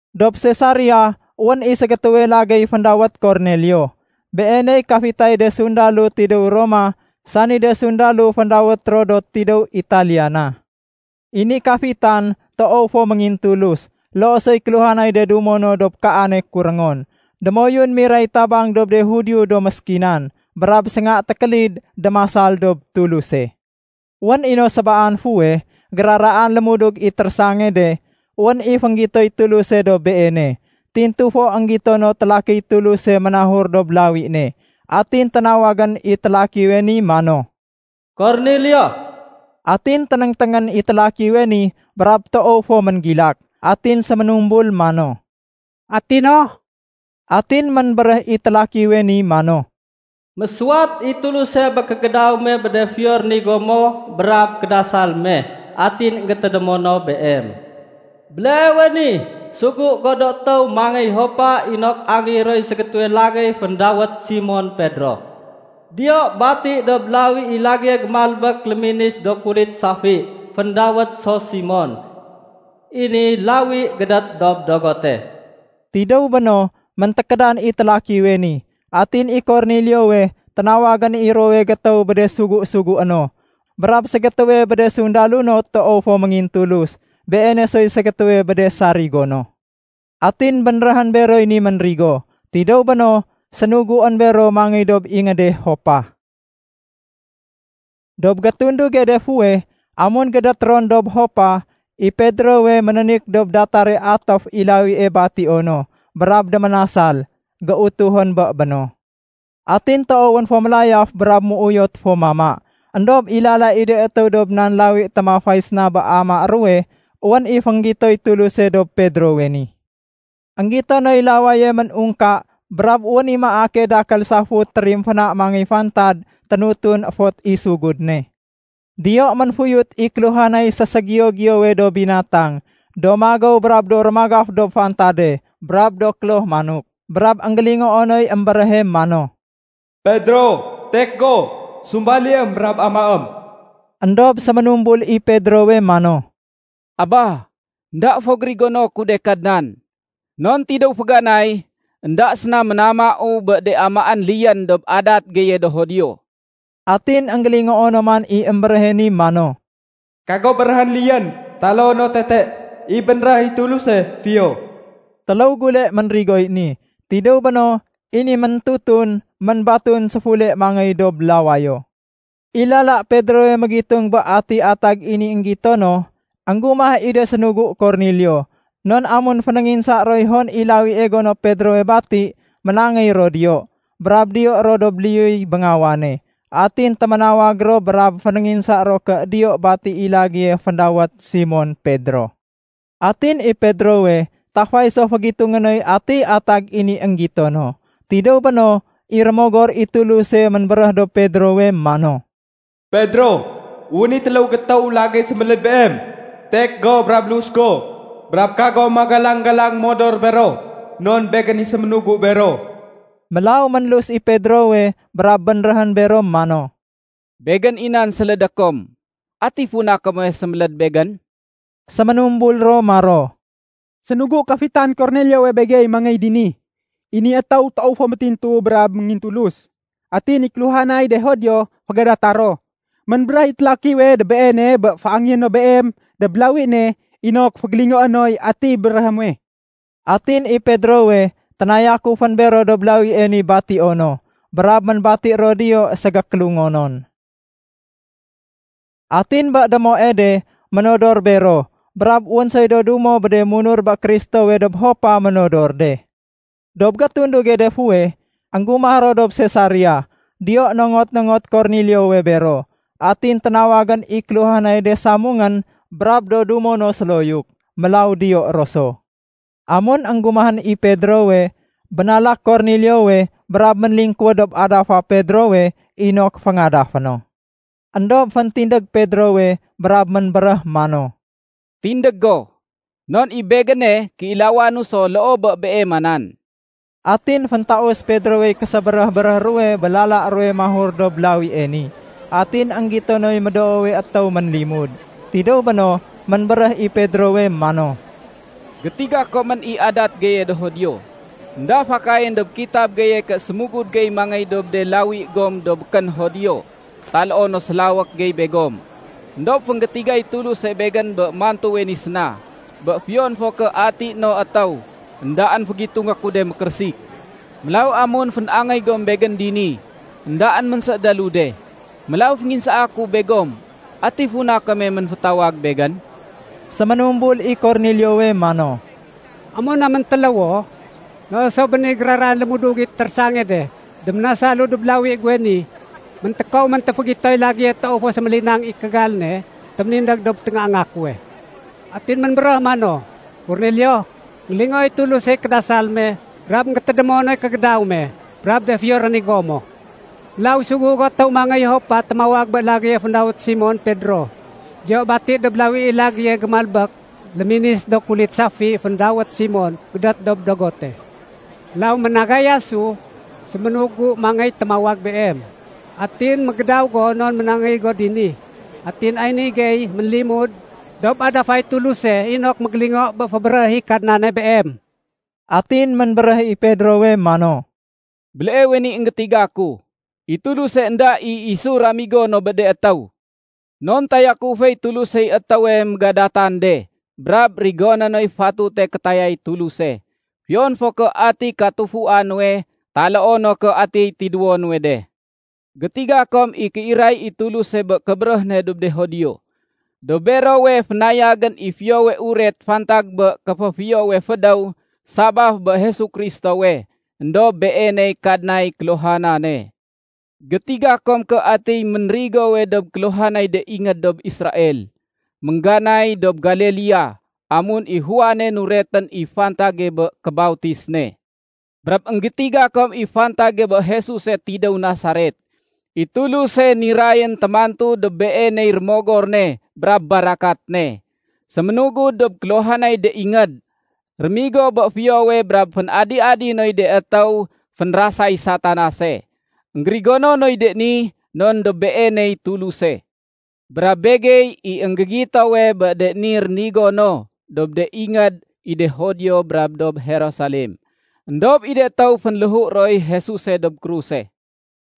Dob Sesaria, wén i ségétéwe lagéy féndawét Kornelio. Beeney kafitay de sundalo tidéw Roma sani de sundalo féndawét ro “Do tidéw Italiana”. I ni kafitan toow fo méngintulus, loo soy kéluhanay de dumo no dob kaane kuréngon. Démoyun miray tabang dob de Judio do méskinan. Brab sénga tékélid démasal dob Tuluse. Wén i no sébaan fuweh, géraraan lémudug i térésange de, wén i fénggitoy Tuluse dob beene. Tintu fo énggito noy télakiy Tuluse ménahur dob lawi ne. Atin ténawag i télakiwe ni mano, “Kornelio!” Atin ténéngténgén i télakiwe ni brab toow fo ménggilak. Atin séménumbul mano, “Ati no?” Atin ménbéréh i télakiwe ni mano, “Mésuwat i Tuluse bé kégédaw me bé de fiyo rénigo mo brab kédasal me. Atin énggétédémo no beem. Béleewe ni, sugu go do étéw mangéy Jopa inok angéyé roy ségétéwe lagéy féndawét Simon Pedro. Diyo bati dob lawi i lagéye gémalbék léminis do kulit safi féndawét so Simon. I ni lawi gédét dob dogote.” Tidéw béno, méntékédan i télakiwe ni. Atin i Korneliowe ténawagén i ruwowe gétéw bé de sugu-sugué no, brab ségétéwe bé de sundalo no toow fo méngintulus. Beene soy ségétéwe bé de sarigo no. Atin bénréhén beroy ni ménrigo. Tidéw béno, sénuguén bero mangéy dob ingéde Jopa. Dob gétunduge de fuweh, amun gédét ron dob Jopa, i Pedrowe ménénik dob datare atéf i lawie batio no brab déménasal. Géutuhén bé béno. Atin toowén fo mélayaf brab ménuyot fo mama. Endob i lala i de étéw dob nan lawi témafay séna bé amaé ruwe, wén i fénggitoy Tuluse dob Pedrowe ni. Enggito noy lawaye ménungka brab wén i maake dakél safut térimféna mangéy fantad ténutun fot i sugud ne. Diyo ménfuyut i kéluhanay séségiyo-giyowe do binatang do magéw brab do rémagaf dob fantade brab do kloh manok. Brab énggélingoo noy émbéréhe mano, “Pedro, étek go! Sumbaliém brab amaém.” Endob séménumbul i Pedrowe mano, “Aba, énda fo gérigono ku de, Kadnan. Non tidéw féganay, énda séna ménamau bé de amaén liyén dob adat geye do Judio.” Atin énggélingoo no man i émbéréhe ni mano, “Kago béréhén liyén taloo no tete i bénréh i Tuluse fiyo.” Téléw gule ménrigoy ni. Tidéw béno, i ni méntutun ménbatun séfule mangéy dob lawayo. I lala Pedrowe mégitung bé atiy atag i ni énggito no, énggumah i de sénugu Kornelio. Non amun fénénginsa roy hon i lawie gono Pedrowe bati, ménangéy ro diyo. Brab diyo ro dob liyuy béngawane. Atin téménawag ro brab fénénginsa ro ké diyo bati i lagéye féndawét Simon Pedro. Atin i Pedrowe tafay so fégitungé noy atiy atag i ni énggito no. Tidéw béno, i Rémogor i Tuluse ménbéréh dob Pedrowe mano, “Pedro, wén i téléw gétéw lagéy séméléd beem. Tek go brab lus go, brab kago magalang-galang modor bero non Begén i séménugu bero.” Mélaw ménlus i Pedrowe brab bénréhén bero mano, “Begén i nan sélédé kom. Ati funa kome séméléd begén?” Séménumbul ro maro, “Sénugu kafitan Korneliowe begey mangéy dini. I ni étéw toow fo métintu brab méngintulus, atin i kéluhanay de Judio fégadata ro. Ménbéréh i télakiwe dob beene bé féangeyé no beem dob lawi ne inok fégélingoé noy ati béréhé muwe.” Atin i Pedrowe ténayakufén bero dob lawie ni batio no, brab ménbati ro diyo ségékélungonon. Atin bé démoe de ménodor bero brab wén soy do dumo bé de munur bé Kristowe dob Jopa ménodor de. Dob gétunduge de fuweh, énggumah ro dob Sesaria. Diyo nongot-nongot Korneliowe bero. Atin ténawagén i kéluhanay de samungén brab do dumo no séloyuk. Mélaw diyo ro so. Amun énggumahén i Pedrowe, bénalak Korneliowe brab ménlingkuwéd dob adafa Pedrowe inok féngadafé no. Endob féntindég Pedrowe brab ménbéréh mano, “Tindég go, non i begéne kéilawanu so loo bé beema nan.” Atin féntaus Pedrowey késébéréh-béréh ruwe bé lala ruwe mahur dob lawie ni, atin énggito noy médoowe étéw ménlimud. Tidéw béno ménbéréh i Pedrowe mano, “Gétiga komén i adat geye do Judio. Enda fakayén dob kitab geye ké sémugud gey mangéy dob de lawi gom do békén Judio taloo no sélawék gey begom. Endob fénggétigay Tuluse begén bé mantuwe ni séna, bé fiyon fo ké ati no étéw, éndaén fégitungé ku de mékérésik. Mélaw amun fén-angéy gom begén dini, éndaén ménsédélu de. Mélaw fénginsaa ku begom, ati funa kome ménfétawag begén?” Séménumbul i Korneliowe mano, “Amun naméntéléwo, loo so béni géraraan lémudug i térésange de, déménasalu dob lawi guwe ni. Méntékow méntéfégitoy lagéye toow fo sémélinang i kégal ne téménindég dob téngaanga kuwe. Atin ménbéréh mano, ‘Kornelio, énggélingooy Tulusey kédasal me brab énggétédémo noy kégédaw me brab de fiyo rénigo mo. Mélaw sugu go étéw mangéy Jopa témawag bé lagéye féndawét Simon Pedro. Diyo bati dob lawi i lagéye gémalbék léminis do kulit safi féndawét Simon gédét dob dogote.’ Mélaw ménagayasu séménugu mangéy témawag beem. Atin mégédaw go non ménangéy go dini. Atin ay ni gey ménlimud dob adafay Tuluse inok mégélingo bé fébéréh i Kadnane beem.” Atin ménbéréh i Pedrowe mano, “Béleewe ni énggétiga ku, i Tuluse énda i isu ramigo no bé de étéw. Non tayakuféy Tulusey étéwe mégadatan de brab rigoné noy fatute kétayay Tuluse, fiyon fo ké ati katufua nuwe taloo no ké ati tidéwo nuwe de. Gétiga kom i kéiray i Tuluse bé kébéréh ne dob de Judio. Dob berowe fénayagén i Fiyowe Uret fantag bé kéféfiyowe fédéw sabaf bé Jesu Kristowe. Endob Beeney Kadnay kéluhanane. Gétiga kom ké ati ménrigowe dob kéluhanay de ingéd dob Israel, méngganay dob Galilea amun i Juane nuretén i fantage bé kébautis ne. Brab énggétiga kom i fantage bé Jesuse tidéw Nasaret. I Tuluse nirayén témantu dob Beeney Rémogor ne brab barakat ne. Séménugud dob kéluhanay de ingéd, rémigo bé fiyowe brab fén-adi-adi noy de étéw fénrasay Satanase. Enggérigono noy de ni non dob Beeney Tuluse. Brab begey i énggégitowe bé de ni rénigo no dob de ingéd i de Judio brab dob Jerusalem. Endob i de étéw fénléhu roy Jesuse dob kruse.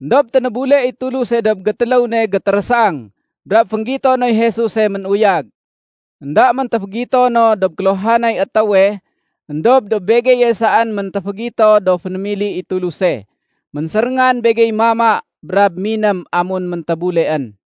Endob ténébule i Tuluse dob gétéléw ne gétérésang brab fénggito noy Jesuse ménuyag. Enda méntéfégito no dob kéluhanay étéwe éndob dob begeye saén méntéfégito do fénémili i Tuluse. Ménséréngan begey mama brab miném amun méntébuleén.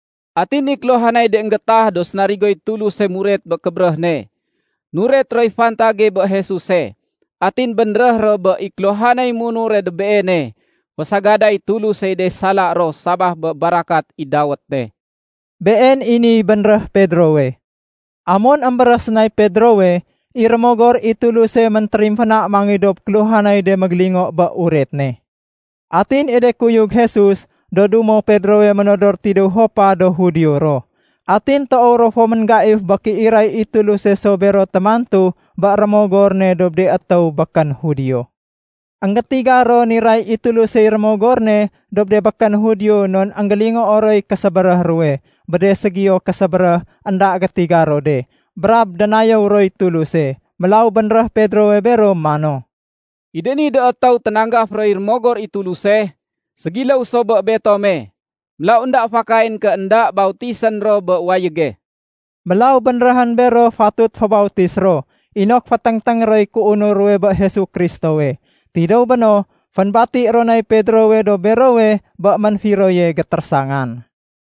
Atin i kéluhanay de énggétah do sénarigoy Tuluse muret bé kébéréh ne, nuret roy fantage bé Jesuse. Atin bénréh ro bé i kéluhanay munure dob Beene, fésagaday Tulusey de sala ro sabaf bé barakat i dawét ne.” Been i niy bénréh Pedrowe. Amun émbéréh sénay Pedrowe, i Rémogor i Tuluse méntérimféna mangéy dob kéluhanay de mégélingo bé uret ne. Atin i de kuyug Jesus do dumo Pedrowe ménodor de tidéw Jopa do Judio ro. Atin toow ro fo ménggaif bé kéiray i Tuluse so témantu bé Rémogor ne dob de étéw békén Judio. Enggétiga ro niray i Tulusey Rémogor ne dob de békén Judio non énggélingoo roy késébéréh ruwe bé de ségiyo késébéréh énda gétiga ro de brab dénayéw roy Tuluse. Mélaw bénréh Pedrowe bero mano, “I de ni do étéw ténanggaf roy Rémogor i Tuluse, ségiléw so bé betome. Mélaw énda fakayén ké énda bautisén ro bé wayége.” Mélaw bénréhén bero fatut fébautis ro inok féténgténg roy kéunur ruwe bé Jesu Kristowe. Tidéw béno, fénbati ro nay Pedrowe dob berowe bé ménfiroye gétérésangan.